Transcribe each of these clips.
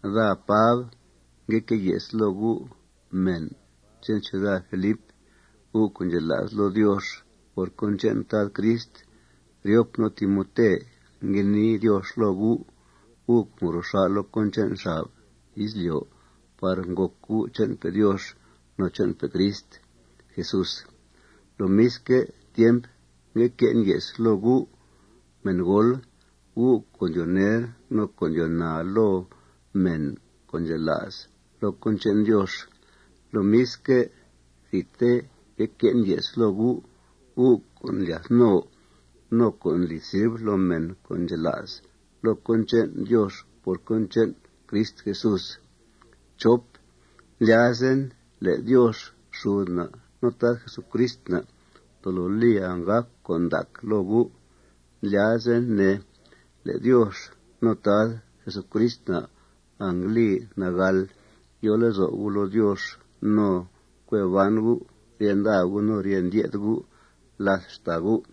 Daa, Pab, ngue que' ye's loo gu', mèn che'n ciuda Filip, gu' co' ndxela's loo Diox por cón che'n Tad Crist. Ryop nu' Timote ngue nii Diox loo gu', gu' co' ngro xà' loo cón che'n xab izlyo' par ngòc gu' che'npe' Diox no che'npe' Crist Jesús. Lomisque' tiemp, ngue que'en ye's loo gu' mèngool, gu' co' ndyoo ner no co' ndyoo naa loo mèn co' ndxela's loo cón che'n Diox. Lomisque', thidte ngue que'en ye's loo gu', gu' co' ndlyath no no co' ndli sirv loo mèn co' ndxela's loo cón che'n Diox por cón che'n Crist Jesús. Ndlyazen le' Diox xud na' no Tad Jesucrist na' tolo li anggàc con' ndac loo gu'. Ndlyazen, ne, le' Diox no Tad Jesucrist na' angli nagàl yo lezo' gu' loo Diox no cue ban gu' rye nda gu' no rye ndye'th gu' làth xtàa gu'.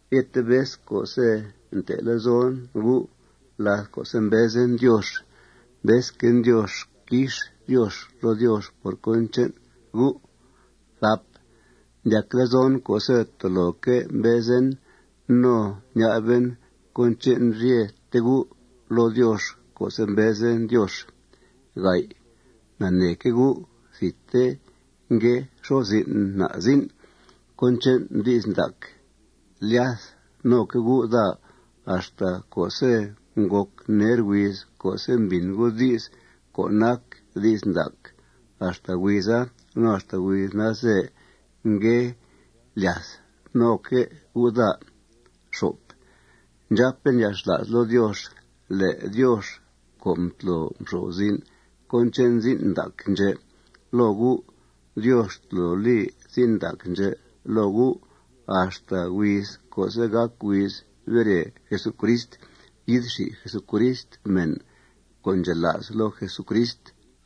Ryete vez co'se' nte' lezon gu' láth co'se' mbezen Diox, mbezquen Diox quix Diox loo Diox por cón che'n gu'. Ndyac lezon co'se' toloque' mbezen no ña'ben cón che'n ryete gu' loo Diox co'se' mbezen Diox. Naneeque' gu' thidte ngue xo'f zin' na' zin' cón che'n di's ndac. Ndlyath noque' gu' daa axta co'se' ngòc ner huiz co'se' mbìn gu' di's co' nac di's ndac. Axta huiza no axta huiz nalze ngue lyath noque' gu' daa. Ndxàpen yalxla's loo Diox le' Diox co' mtlo mxo'f zin' cón che'n zin' ndac ndxè' loo gu', Diox tolo li zin' ndac ndxè' loo gu' axta huiz co'se' gàc huiz bere Jesucrist, yi'th xi Jesucrist mèn co' ndxela's loo Jesucrist.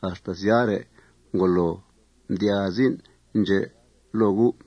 Axta syare', ngolo mdyaa zin' ndxè' loo gu'.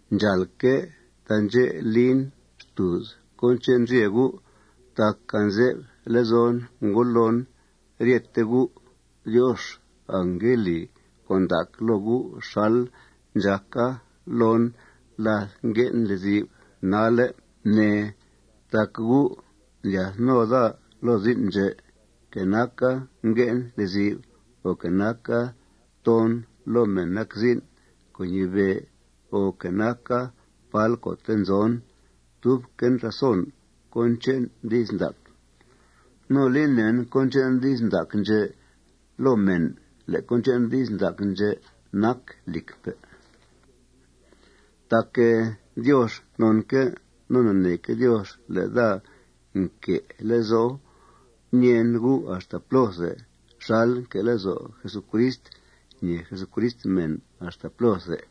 Ndxàalque' taandxè' lin xtùuz cón che'n ryete gu'. Tac anze'f lezon ngudloon ryete gu'. Diox angngue li con' ndac loo gu' xal ndxàca loon láth ngue'en lezi'f nalle', ne, tac gu' ndlyath no daa loo zin' ndxè'. Que naca ngue'en lezi'f, o que naca toon loo mèn nac zin' co' ñibe', o que naca pál co'te' nzon, tubquen razon cón che'n di's ndac. No li nèen cón che'n di's ndac ndxè' loo mèn le' cón che'n di's ndac ndxè' nac lìcpe'. Tac Diox nonque' no naneeque' Diox le' daa nque' lezo' ñèen gu' axta plóthe xalque' nque' lezo' Jesucrist ñèe Jesucrist mèn axta plóthe.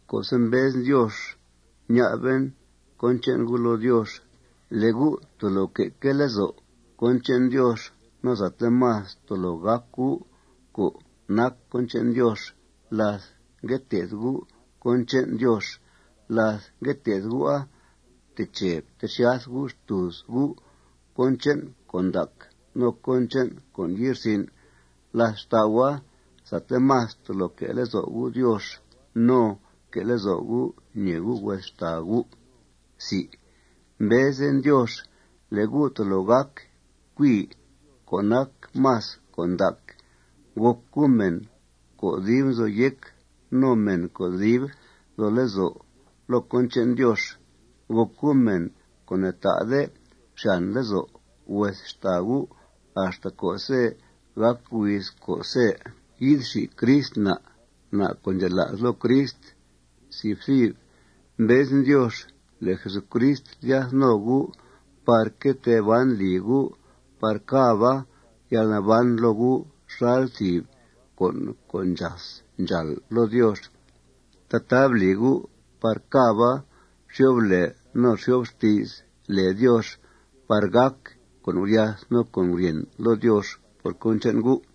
Co'se' mbezen Diox, ña'ben cón che'n gu' loo Diox le' gu' tolo que'que' lezo' cón che'n Diox no sate más tolo gác gu' co' nac cón che'n Diox láth ngue té'th gu' cón che'n Diox. Láth ngue té'th gu'a, fteche ftexyath gu' xtùuz gu' cón che'n con' ndac no cón che'n con' ye'rsin'. Làth xtau'a, sate más tolo que' lezo' gu' Diox no que' lezo' gu' ñèe gu' hues xtàa gu'. Mbezen Diox le' gu' tolo gác cui co' nac más con' ndac. Gòc gu' mèn co' dib nzo yéc no mèn co' dib nzo lezo' loo cón che'n Diox. Gòc gu' mèn co' ne'ta'de xyàn lezo' hues xtàa gu' axta co'se' gàc huiz co'se' yi'th xi Crist na', na' co' ndxela's loo Crist. Mbezen Diox le' Jesucrist lyath no gu' par que tee ban lì gu' par càba yalnaban loo gu' xal thìb con' co' ndxas ndxàl loo Diox. Tataa bli gu' par càba xyo'f lèe no xyo'f xti's lèe Diox par gàc con' guryath no con' guryèn loo Diox por cón che'n gu'.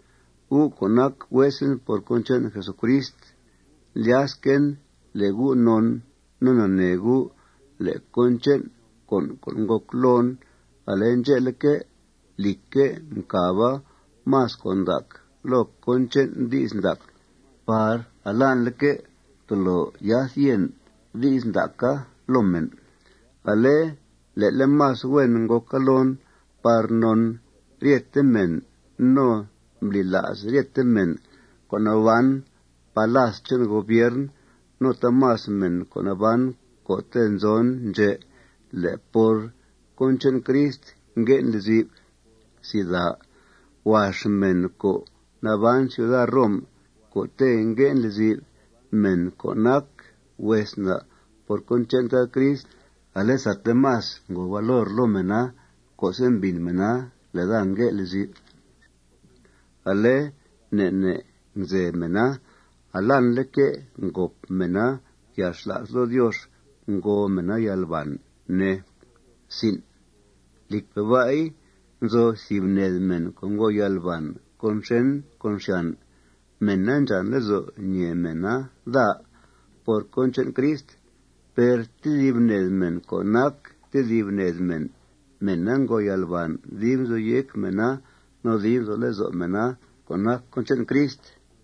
Gu' co' nac huesen por cón che'n Jesucrist, ndlyasquen le' gu' non no nanee gu' le' cón che'n con' co' ngòc loon, ale ndxe'leque', lìcque', mcàba más con' ndac loo cón che'n di's ndac par alanleque' tolo yath yèn di's ndaca loo mèn. Ale le'le' más huen ngòca loon par non ryete mèn no mbli la's ryete mèn co' naban palas che'n gobiern no taamas mèn co' naban co'te' nzon ndxè' le' por cón che'n Crist ngue'en lezi'f. Huax mèn co' naban ciuda Rom co'te' ngue'en lezi'f, mèn co' nac hues na' por cón che'n Tad Crist, ale sate más ngòo valor loo mèna co'se' mbìn mèna le' daa ngue' lezi'f. Ale ne' ne' ngzeb mèna. Alanleque' ngòp mèna yalxla's loo Diox. Ngo mèna yalbàn, ne. Lìcpe' ba'i, nzo thìb ned mèn co' ngo yalbàn con xèn con xyàn. Mèna ndxàn lezo' ñèe mèna daa por cón che'n Crist. Per tedib ned mèn co' nac tedib ned mèn, mèna ngo yalbàn dib nzo yéc mèna no dib nzo lezo' mèna co' nac cón che'n Crist.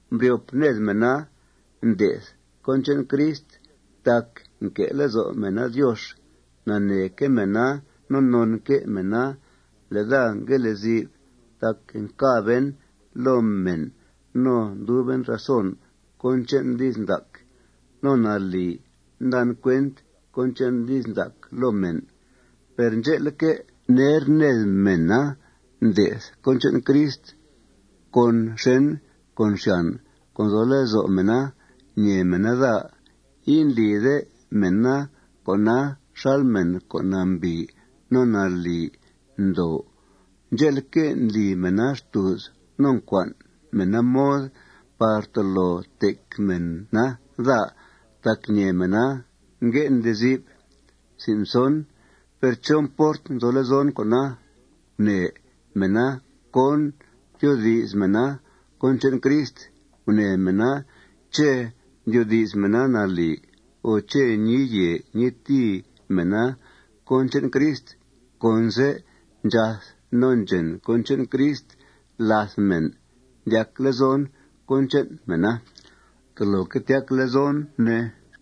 Mbryop ned mèna nde'th cón che'n Crist tac nque' lezo' mèna Diox. Naneeque' mèna no nonque' mèna le' daa ngue' lezi'f tac ncàben loo mèn no nduben razon cón che'n di's ndac. No nalì ndan cuent cón che'n di's ndac loo mèn. Per ndxe'leque', ner ned mèna nde'th cón che'n Crist con xèn con xyàn co' nzo lezo' mèna ñèe mèna daa. Indlide mèna con'a xal mèn co' nambìi no nalì ndoo. Ndxe'leque', ndli mèna xtùuz no ncua'n mèna mod par tolo tec mèna daa tac ñèe mèna ngue'en lezi'f. Per ¿chó mport nzo lezon cona? Gunee mèna cón tyoodi's mèna cón che'n Crist. Gunee mèna ché' ndyoodi's mèna nalì o ché' ñii yèe ñii tìi mèna cón che'n Crist. Conse' ndxath no ndxèn cón che'n Crist làth mèn, ndyac lezon cón che'n mèna. Toloque' tyac lezon, ne.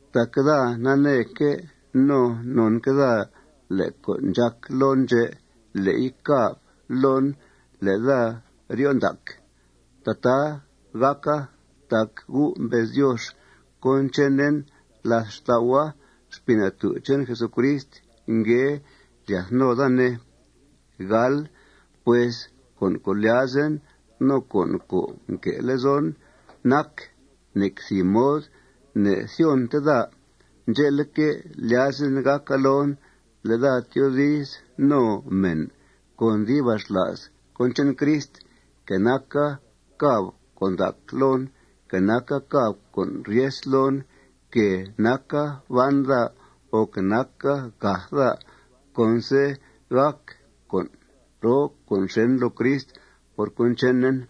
Tac daa naneeque' no nonque' daa le' con' ndxàc loon ndxè', le'i càb loon le' daa ryo' ndac. Tataa gàca tac gu' mbez Diox cón chenen. Làth xtau'a, Xpii Natú' che'n Jesucrist ngue lyath no daa, ne. Pues con' co' lyazen no con' co' nquee lezon nac: Nec thìb mod ne'thyonte daa. Ndxe'leque', lyazen gàca loon le' daa tyoodiz no mèn con dibaxla's cón che'n Crist, que naca càb con' ndac loon, que naca càb con' ryes loon, que naca ban daa, o que naca gath daa, conse' gàc con' roo con' xèn loo Crist por cón chenen.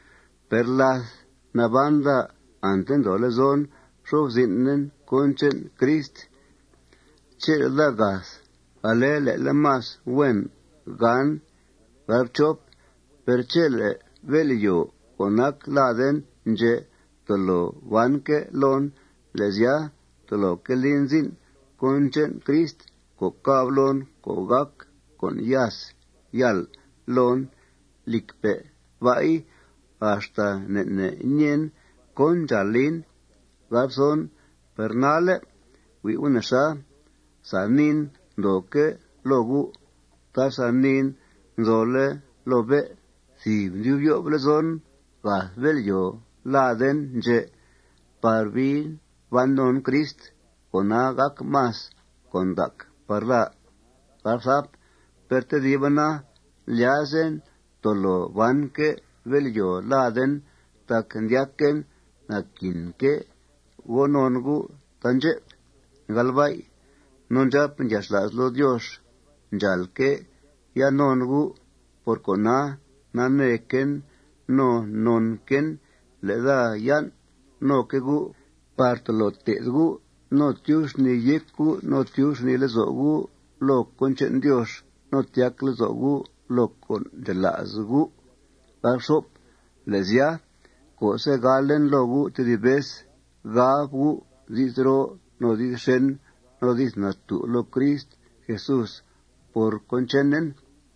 Per láth naban daa, ante ndoo lezon nxo'f zin'en cón che'n Crist. Chele' daa gath, ale le'le' más huen gan. Per chele' bél'yòo co' nac laden ndxè' tolo banque' loon, le' sya, toloque' lin zin' cón che'n Crist co' càb loon co' gàc con' yas yàl loon. Lìcpe' ba'i, axta ne' ne' ñeen cón ndxàal lin. Per nalle', hui' gu' nexa. Sa niin ndooque' loo gu'. Taasa niin nzole' loo bé'. Thìb ndyub yo'f lezon gath bél'yòo laden ndxè' par bii ban non Crist. Cona, gàc más con' ndac par daa. Per tediba na, lyazen tolo banque' bél'yòo laden tac ndyaquen naquinque' go non gu' taandxep. No ndxàpen yalxla's loo Diox ndxàalque' yan' non gu'. Por cona, naneequen no nonquen le' daa yan' noque' gu' par tolo té'th gu' no tyub xnìi yéc gu' no tyub xnìi lezo' gu' loo cón che'n Diox no tyac lezo' gu' loo con' co' ndxela's gu'. Le' sya, co'se' galen loo gu' tedib vez, gab gu' di's roo no di's xèn no di's natú' loo Crist Jesús por cón chenen.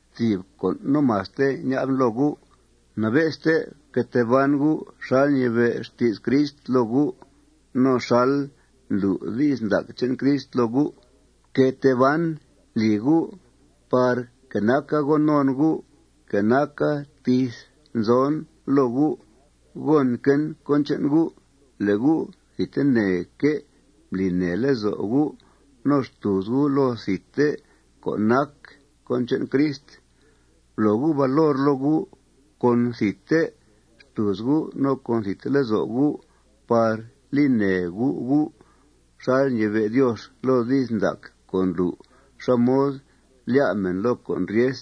Thìb con' no maste ña'ben loo gu': Nabe'ste fque tee ban gu' xal ñibe' xti's Crist loo gu' no xal ndlu' di's ndac che'n Crist loo gu'. Fque tee ban lì gu' par que naca go non gu', que naca tith nzon loo gu', gònquen cón che'n gu' le' gu' thidteneque' mbli nèe lezo' gu' no xtùuz gu' loo thidte co' nac cón che'n Crist. Blo gu' valor loo gu' con thidte xtùuz gu' no con thidte lezo' gu' par li nèe gu' gu' xal ñibe' Diox loo di's ndac co' ndlu' xá mod lyá' mèn loo con' ryes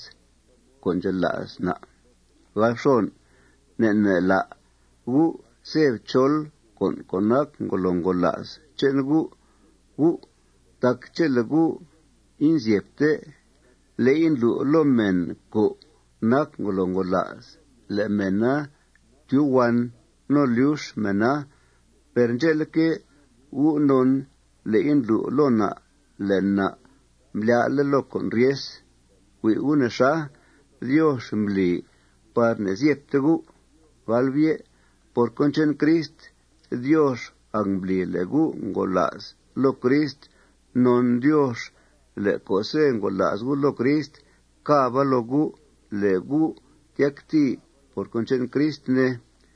co' ndxela's na'. Ne' ne' la' gu' ze'b chol con' co' nac ngolo ngola's che'n gu' gu'. Tac chele' gu' inzyebte, le'i ndlu' loo mèn co' nac ngolo ngola'sa le' mèna tyuhuan no lyux mèna. Per ndxe'leque', gu' non le'i ndlu' loo na' le' na' mblyá'le' loo con' ryes. Hui' gu' nexa. Diox mbli par ne'zyebte gu'. Por cón che'n Crist, Diox angmbli le' gu' ngola's loo Crist. Non Diox le' co'se' ngola's gu' loo Crist, càba loo gu' le' gu' tyactìi por cón che'n Crist, ne.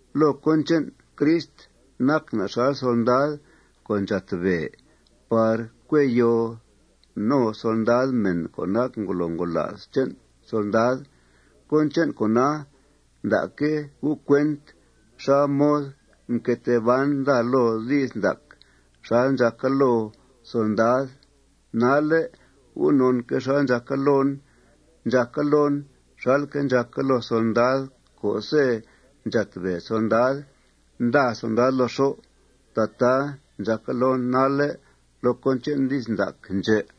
Loo cón che'n Crist nac na' xal solndad co' ndxátbèe par cue yoo no solndad mèn co' nac ngolo ngola's che'n solndad. Cón che'n con'a, nda'que' gu' cuent xá mod mque tee ban daa loo di's ndac xal ndxàca loo solndada. Nalle' gu' nonque' xal ndxàca loon. Ndxàca loon xalque' ndxàca loo solndad co'se' ndxátbèe solndad, nda solndad loo xó'. Tataa ndxàca loon nalle' loo cón che'n di's ndac ndxè'.